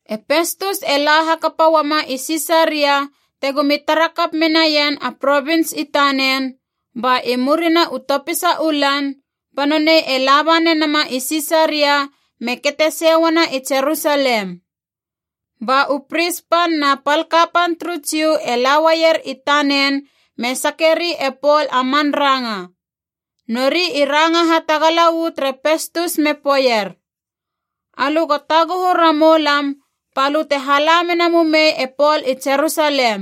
E Pestus e la hakapa uama i Sisaria tegomi tara kap menaien a provins i tanen, ba i murina u topisa u lan ba nonei e laba nenama i Sisaria me kete sei uana i Jerusalem. Ba u pris pan na pal kapan turu Jiu e la uaier i tanen me sakeri e Pol a man ranga. Nori i ranga hatagala uu tere Pestus me poeier, “Alö go taguhu ramou lam balö te hala mena mumei e Pol i Jerusalem.”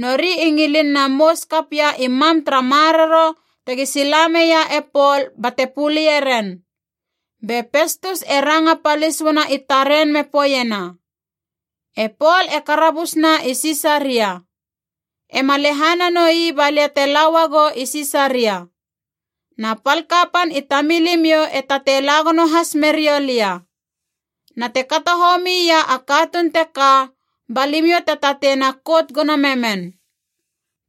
Nori i ngilin na mous kap ia i mam tara maroro tegi sila meia e Pol bate pulie ren. Be Pestus e ranga palis uana i taren me poeiena, “E Pol e karabus na i Sisaria. E ma lehana noi balia te la uagou i Sisaria. Na pal kapan i tamilimiou e tatei la gono has meriou lia. Na te kato homi ia a katuun teka ba limiou te tatei na kout gono memen.”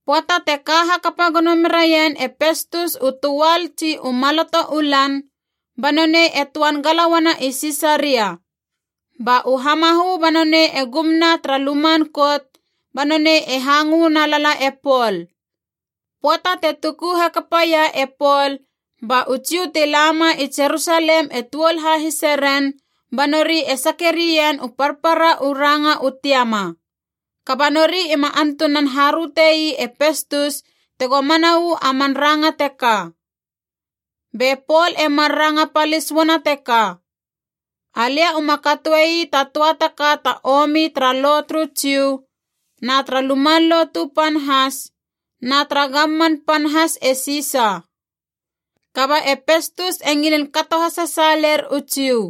Pöata te ka hakapa gono meraien e Pestus u töal tsi u maloto u lan, ba nonei e töan gala uana i Sisaria. Ba u hamahö ba nonei e gumna tara luman kout, ba nonei e hangö na lala e Pol. Pöata te tuku hakapa ia e Pol ba u Jiu ti lama i Jerusalem e tuol hahise ren, ba nori e sake rien u parpara u ranga u tiama. Kaba nori ima antunan haröte ii e Pestus tego mana uu a man ranga teka. Be Pol e mar ranga palis uana teka, “Alia uma katoe ii ta töa ta ka ta omi tara lo turu Jiu, na tara Luman Lotu Pan has, na tara gamman pan has e Sisa.” Kaba e Pestus e ngilin kato hasasaaler u Jiu.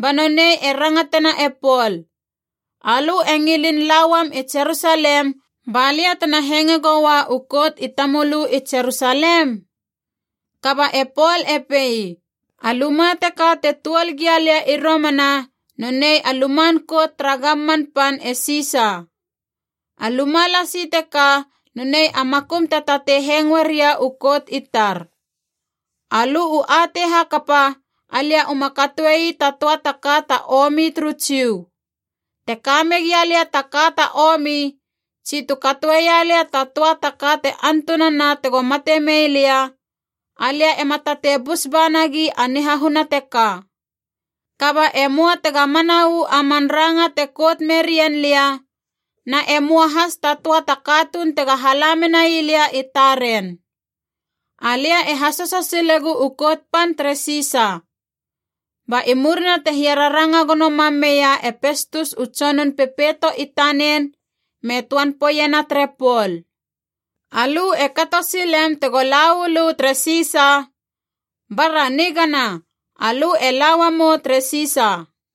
Ba nonei e rangatena e Pol, “Alö e ngilin la uam i Jerusalem balia tena hengoe goua u kout i tamölö i Jerusalem?” Kaba e Pol e pei, “A luma teka te tuol gia lia i romana nonei a luman kout tara gamman pan e Sisa. A luma lasi teka nonei a makum te tatei hengoe ria u kout i tar. Alö u atei hakapa, alia uma katoe ii ta töa ta ka ta omi turu Jiu. Te ka megia lia ta ka ta omi, tsi tu katoeia lia ta töa ta ka te antunana tego mate mei lia, alia ema tatei bus ba nagi a nihahuna teka. Kaba e möa tega mana uu a man ranga te kout merien lia, na e möa has ta töa ta katuun tega hala menai lia i taren. Alia e hasoso silegu u kout pan tere Sisa!” Ba i murina te hiararanga gono mam meia e Pestus u tsonun pepeito i tanen me töan poeiena tere Pol, “Alö e kato silem tego la uu lö tere Sisa, bara nigana, alö e la uamou tere Sisa.”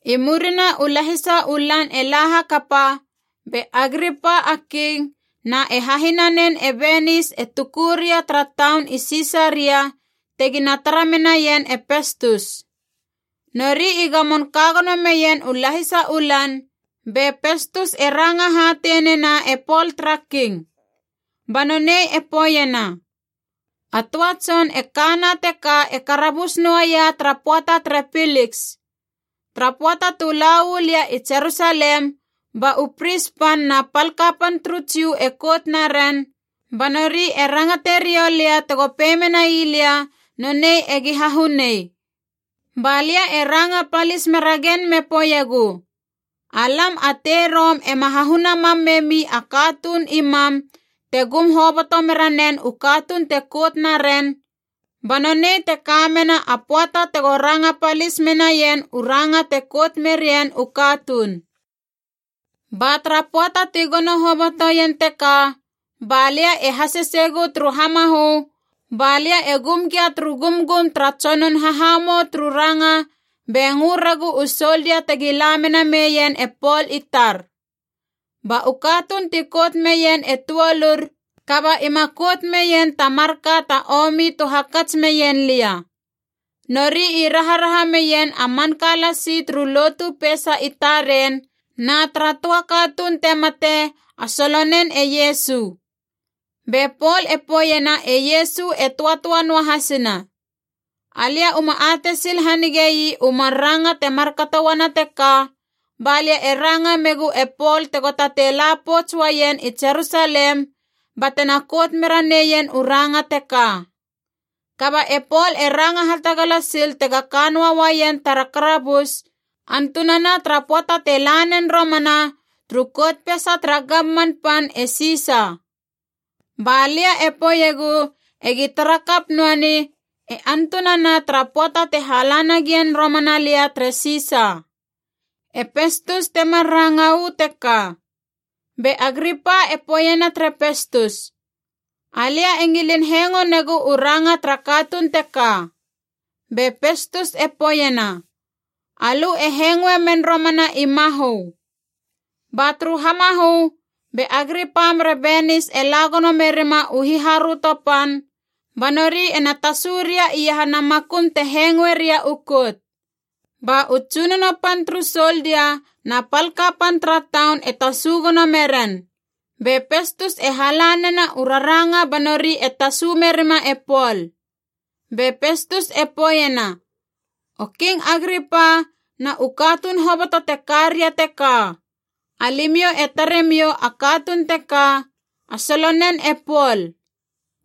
I murina u lahisa u lan e la hakapa be Agripa a King na e hahinanen e Benis e tuku ria tara taun i Sisaria tegina tara menaien e Pestus. Nori i gamon ka gono meien u lahisa u lan, be Pestus e ranga hatei nena e Pol tara king. Ba nonei e poeiena, “A töa tson e kana teka e karabus noaia tara pöata tere Piliks. Tara pöata tu la uu lia i Jerusalem ba u pris pan na pal kapan turu Jiu e kout naren, ba nori e rangate riou lia tego pei menai lia nonei egi hahunei. Ba lia e ranga palis meragen me poeiegu, ‘Alam a tei Rom ema hahuna mam memi a katuun i mam te gum hoboto mera nen u katuun te kout na ren, ba nonei te ka mena a pöata tego ranga palis menaien u ranga te kout merien u katuun.’ “Ba tara pöata ti gono hobotoien teka ba lia e haseseigu turu hamahö ba lia e gum gia turu gumgum tara tsonun hahamou turu ranga be ngö regu u soldia tegi la mena meien e Pol i tar. Ba u katuun ti kout meien e tuolur, kaba ima kout meien ta marka ta omi tu hakats meien lia. Nori i raharaha meien a manka lasi turu lotu peisa i taren na tara töa katuun te mate, a solonen e Iesu. Be Pol e poeiena e Iesu e töatöa noahasina. Alia uma atei sil hanigei u mar ranga te markato uana teka, ba lia e ranga megu e Pol tego tatei la pouts uaien i Jerusalem batena kout mera neien u ranga teka. Kaba e Pol e ranga hatagala sil tega ka noa uaien tara karabus antunana tara pöata te la nen romana turu kout peisa tara gamman pan e Sisa. Balia e poeiegu egi tara kap noani e antunana tara pöata te hala nagien romana lia tere Sisa.” E Pestus te mar ranga uu teka. Be Agripa e poeiena tere Pestus, “Alia e ngilin hengo negu u ranga tara katuun teka.” Be Pestus e poeiena, “Alö e hengoe men romana i mahö.” Ba turu hamahö be Agripa mere Benis e la gono merima u hiharöto pan, ba nori ena tasu ria iahana makum te hengoe ria u kout. Ba u tsunono pan turu soldia na pal kapan tara taun e tasu gono meren. Be Pestus e hala nena u raranga ba nori e tasu merima e Pol. Be Pestus e poeiena, “O King Agripa na u katuun hoboto te ka ria teka. Alimiou e tare miou a katuun teka, a solonen e Pol.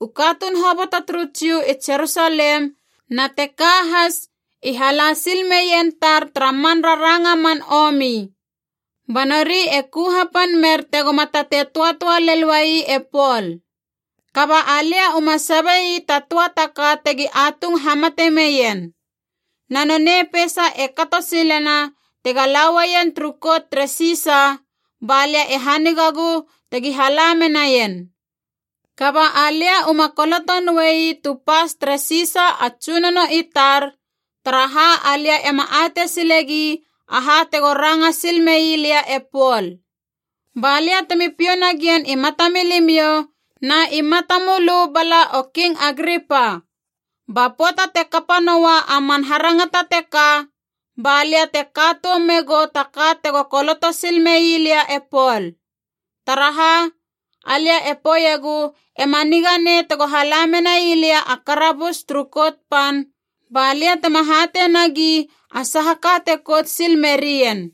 U katuun hoboto turu Jiu i Jerusalem na teka has i hala sil meien tar tara man raranga man omi. Ba nori e ku hapan mer tegoma tatei töatöa lel uai e Pol. Kaba alia uma sabei ta töa ta ka te tegi atung hamate meien. Na nonei peisa e kato silena tega lauaien turu kout tere Sisa, balia e hanigagu tegi hala menaien. Kaba alia uma koloto noei tu pas tere Sisa a tsunono i tar, taraha alia ema atei silegi aha tego ranga sil mei lia e Pol. Balia temi piou nagien i matamilimiou, na i mata mölö bala o King Agripa. Ba pöata te kapa noa a man harangata teka balia te ka toum megou ta ka tego koloto sil mei lia e Pol. Taraha, alia e poeiegu ema niga nei tego hala menai lia a karabus turu kout pan balia tema hatei nagi a saha ka te kout sil merien.”